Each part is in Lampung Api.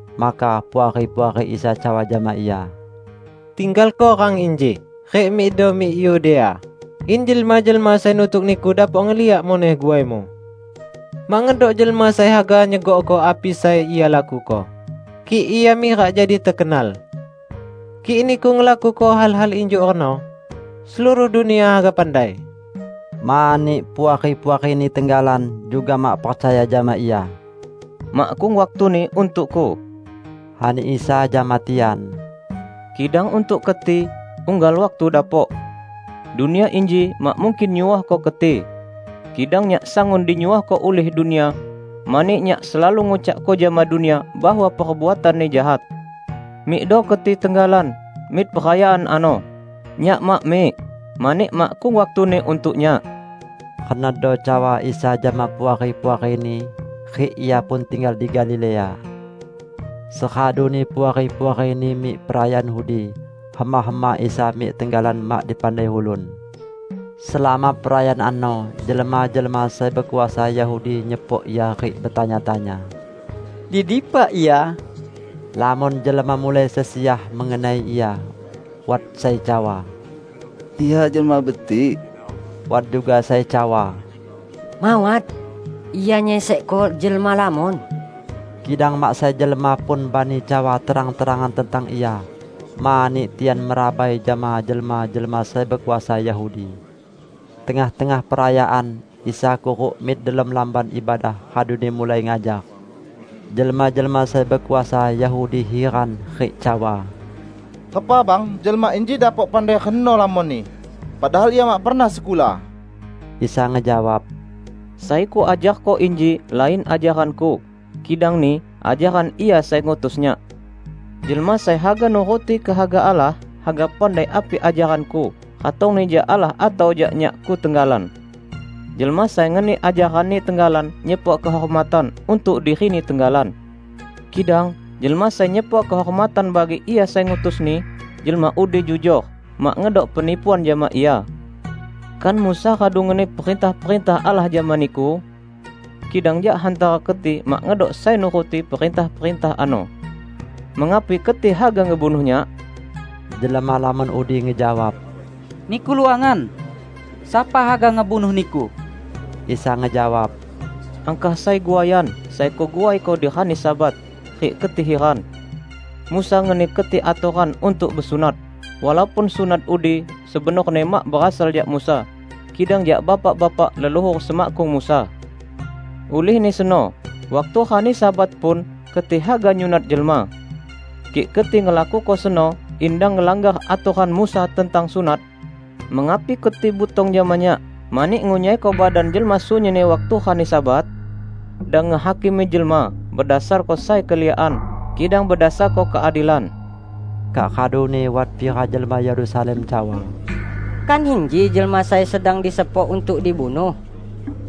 Maka puari-puari Isa cawa jama Ia, "Tinggalko rang inji rik mikdo mik Yudea, in jelma-jelma sai nutuk Niku dapok ngeliak muneh guai-Mu. Mak ngedok jelma sai haga nyegokko api sai ia lakuko, kik ia mirak jadi tekenal. Kik Niku ngelakuko hal-hal injuk reno, seluruh dunia haga pandai." ( Mani puari-puari-Ni tenggalan juga mak percaya jama Ia.) "Makkung waktuni untuk-Ku," ani Isa jama tian, "kidang untuk keti, unggal waktu dapok. Dunia inji mak mungkin nyuohko keti. Kidang Nyak sangun dinyuohko ulih dunia, mani Nyak selalu ngucakko jama dunia bahwa perbuatanni jahat. Mikdo keti tenggalan mik perayaan ano. Nyak mak mik, mani makkung waktuni untuk Nyak." Renodo cawa Isa jama puari-puari-Ni, rik Ia pun tinggal di Galilea. Seraduni puari-puari-Ni mik perayaan udi, hema-hema Isa mik tenggalan mak dipandai ulun. Selama perayaan ano, jelma-jelma sai bekuasa Yahudi nyepok Ia rik betanya-tanya, "Di dipa Ia?" Lamon jelma mulai sesiah mengenai Ia. Wat sai cawa: "Ia jelma betik." Wat juga sai cawa: "Mawat! Ia nyesekko jelma lamon." Kidang mak sai jelma pun bani cawa terang-terangan tentang Ia mani tian merabai jama jelma-jelma sai bekuasa Yahudi. Tengah-tengah perayaan, Isa kuruk mik delom Lamban Ibadah, raduni mulai ngajar. Jelma-jelma sai bekuasa Yahudi hiran rik cawa, "Repa bang jelma inji dapok pandai reno lamonni, padahal Ia mak pernah sekula?" Isa ngejawab, "Sai Kuajarko inji lain ajaran-Ku, kidangni ajaran Ia sai ngutus Nyak. Jelma sai haga nuruti kehaga Allah, haga pandai api ajaran-Ku ratongni jak Allah atau jak Nyak-Ku tenggalan. Jelma sai ngeni ajaranni tenggalan nyepok kehormatan untuk dirini tenggalan. Kidang jelma sai nyepok kehormatan bagi Ia sai ngutusni, jelma udi jujor, mak ngedok penipuan jama ia. Kan Musa radu ngeni perintah-perintah Allah jama niku? Kidang jak hantara keti mak ngedok sai nuruti perintah-perintah ano. Mengapi keti haga ngebunuh Nyak?" Jelma lamon udi ngejawab, "Niku luangan! Sapa haga ngebunuh Niku?" Isa ngejawab, "Angkah sai guaian sai Kuguaiko di rani Sabat, rik keti hiran. Musa ngeni keti atoran untuk besunat -- walaupun sunat udi sebenorni mak berasal jak Musa, kidang jak bapak-bapak leluhur semakkung Musa. Ulihni seno, waktu rani Sabat pun keti haga nyunat jelma. Kik keti ngelakuko seno in dang ngelanggar atoran Musa tentang sunat, mengapi keti butong jama Nyak mani ngunyaiko badan jelma sunyinni waktu rani Sabat? Dang ngehakimi jelma bedasarko sai keliakan, kidang bedasarko keadilan." Kak raduni wat pira jelma Yerusalem cawa, "Kan inji jelma sai sedang disepok untuk dibunuh?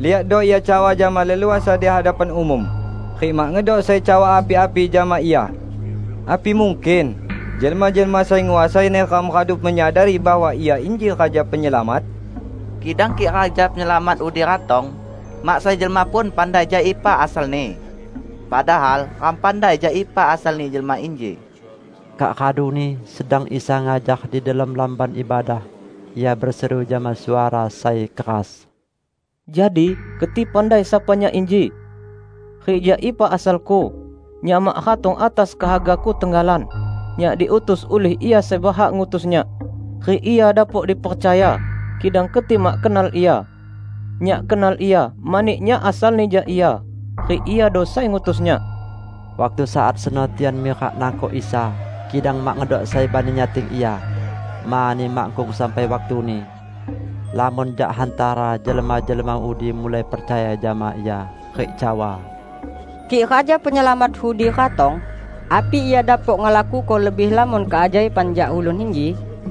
Liakdo Ia cawa jama leluasa di hadapan umum, rik mak ngedok sai cawa api-api jama Ia! Api mungkin jelma-jelma sai nguasai neram radu menyadari bahwa Ia inji Raja Penyelamat? Kidang kik Raja Penyelamat udi ratong, mak sai jelma pun pandai jak ipa asal-Ni! Padahal ram pandai jak ipa asalni jelma inji." Kak raduni, sedang Isa ngajar di delom Lamban Ibadah, Ia beseru jama suara sai keras, "Jadi keti pandai sapa Nyak inji, rik jak ipa asal-Ku? Nyak mak ratong atas kehaga-Ku tenggalan. Nyak diutus ulih Ia sai berhak ngutus Nyak, rik Ia dapok dipercaya. Kidang keti mak kenal Ia. Nyak kenal Ia, mani Nyak asalni jak Ia, rik Iado sai ngutus Nyak." Waktu saat seno tian mirak nangkok Isa, kidang mak ngedok sai bani nyating Ia, mani makkung sampai waktuni. Lamon jak hantara jelma-jelma udi mulai percaya jama Ia, rik cawa, "Kik Raja Penyelamat udi ratong, api Ia dapok ngelakuko lebih lamon keajaiban jak ulun inji?"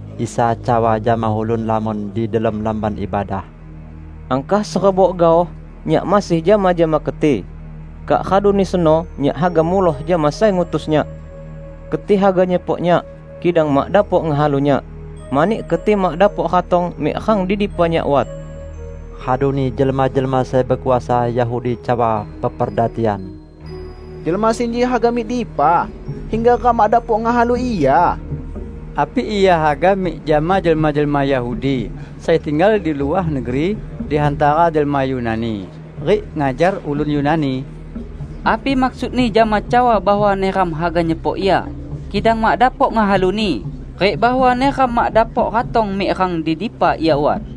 Isa cawa jama ulun lamon di delom Lamban Ibadah, "Angkah serebok gaoh Nyak masih jama-jama keti. Kak raduni seno Nyak haga muloh jama sai ngutus Nyak. Keti haga nyepok Nyak, kidang mak dapok ngehalu Nyak; mani keti mak dapok ratong mik rang di dipa Nyak wat." Raduni jelma-jelma sai bekuasa Yahudi cawa peperda tian, "Jelma sinji haga mik dipa hingga ram mak dapok ngehalu Ia? Api Ia haga mik jama jelma-jelma Yahudi sai tinggal di luah negeri di hantara jelma Yunani, rik ngajar ulun Yunani? Api maksud-Ni jama cawa bahwa neram haga nyepok Ia kidang mak dapok ngehalu-Ni rik bahwa neram mak dapok ratong mik rang di dipa Ia wat?"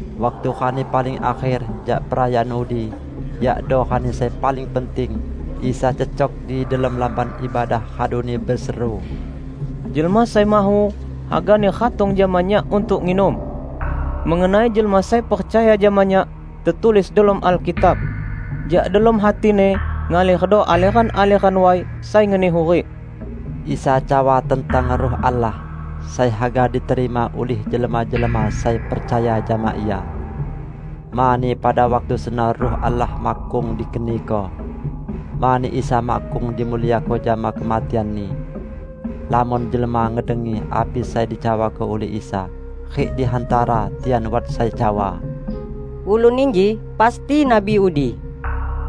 Waktu rani paling akher jak perayaan udi, yakdo rani sai paling penting, Isa cecok di delom Lamban Ibadah raduni beseru, "Jelma sai mahu hagani ratong jama Nyak untuk nginum. Mengenai jelma sai percaya jama Nyak, tetulis delom Alkitab: 'Jak delom hatini ngalerdo aleran-aleran way sai ngeni hurik.' " ( Isa cawa tentang Ruh Allah, sai haga diterima ulih jelma-jelma sai percaya jama Ia. Mani pada waktu seno Ruh Allah makkung dikeniko; mani Isa makkung dimuliako jama kematian-Ni.) Lamon jelma ngedengi api sai dicawako ulih Isa, rik di hantara tian wat sai cawa, "Ulun inji pasti Nabi udi!"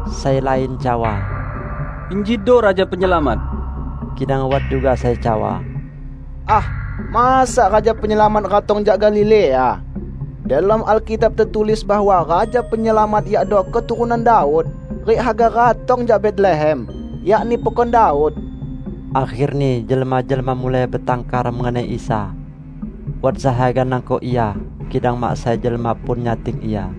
Sai lain cawa, "Injido Raja Penyelamat!" Kidang wat juga sai cawa, "Ah, masa Raja Penyelamat ratong jak Galilea? Delom Alkitab tetulis bahwa Raja Penyelamat yakdo keturunan Daud rik haga ratong jak Betlehem, yakni pekon Daud." Akherni jelma-jelma mulai betangkar mengenai Isa. Wat sai haga nangkok Ia, kidang mak sai jelma pun nyating Ia.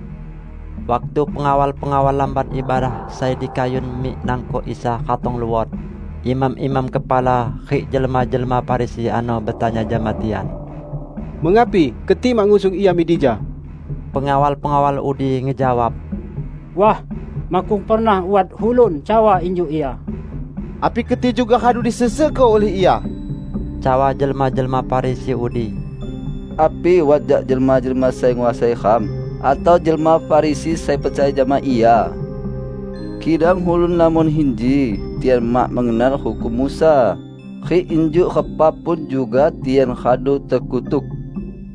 Waktu pengawal-pengawal Lamban Ibadah sai dikayun mik nangkok Isa ratong luot, imam-imam kepala rik jelma-jelma Farisi ano betanya jama tian, "Mengapi keti mak ngusung Ia mik dija?" Pengawal-pengawal udi ngejawab, "Wah, makkung pernah wat ulun cawa injuk Ia!" "Api keti juga radu disesekko ulih Ia?" cawa jelma-jelma Farisi udi. "Api wat jak jelma-jelma sai nguasai ram atau jelma Farisi sai percaya jama Ia? Kidang ulun lamon inji, tian mak mengenal hukum Musa, rik injuk repa pun juga tian radu tekutuk."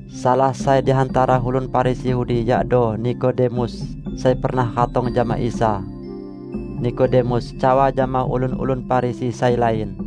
Salah sai di hantara ulun Farisi udi yakdo Nikodemus sai pernah ratong jama Isa. Nikodemus cawa jama ulun-ulun Farisi sai lain.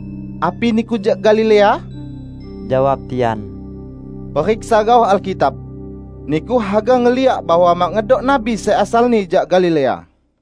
"Api niku jak Galilea?" jawab tian. "Periksa gaoh Alkitab! Niku haga ngeliak bahwa mak ngedok nabi sai asalni jak Galilea!" [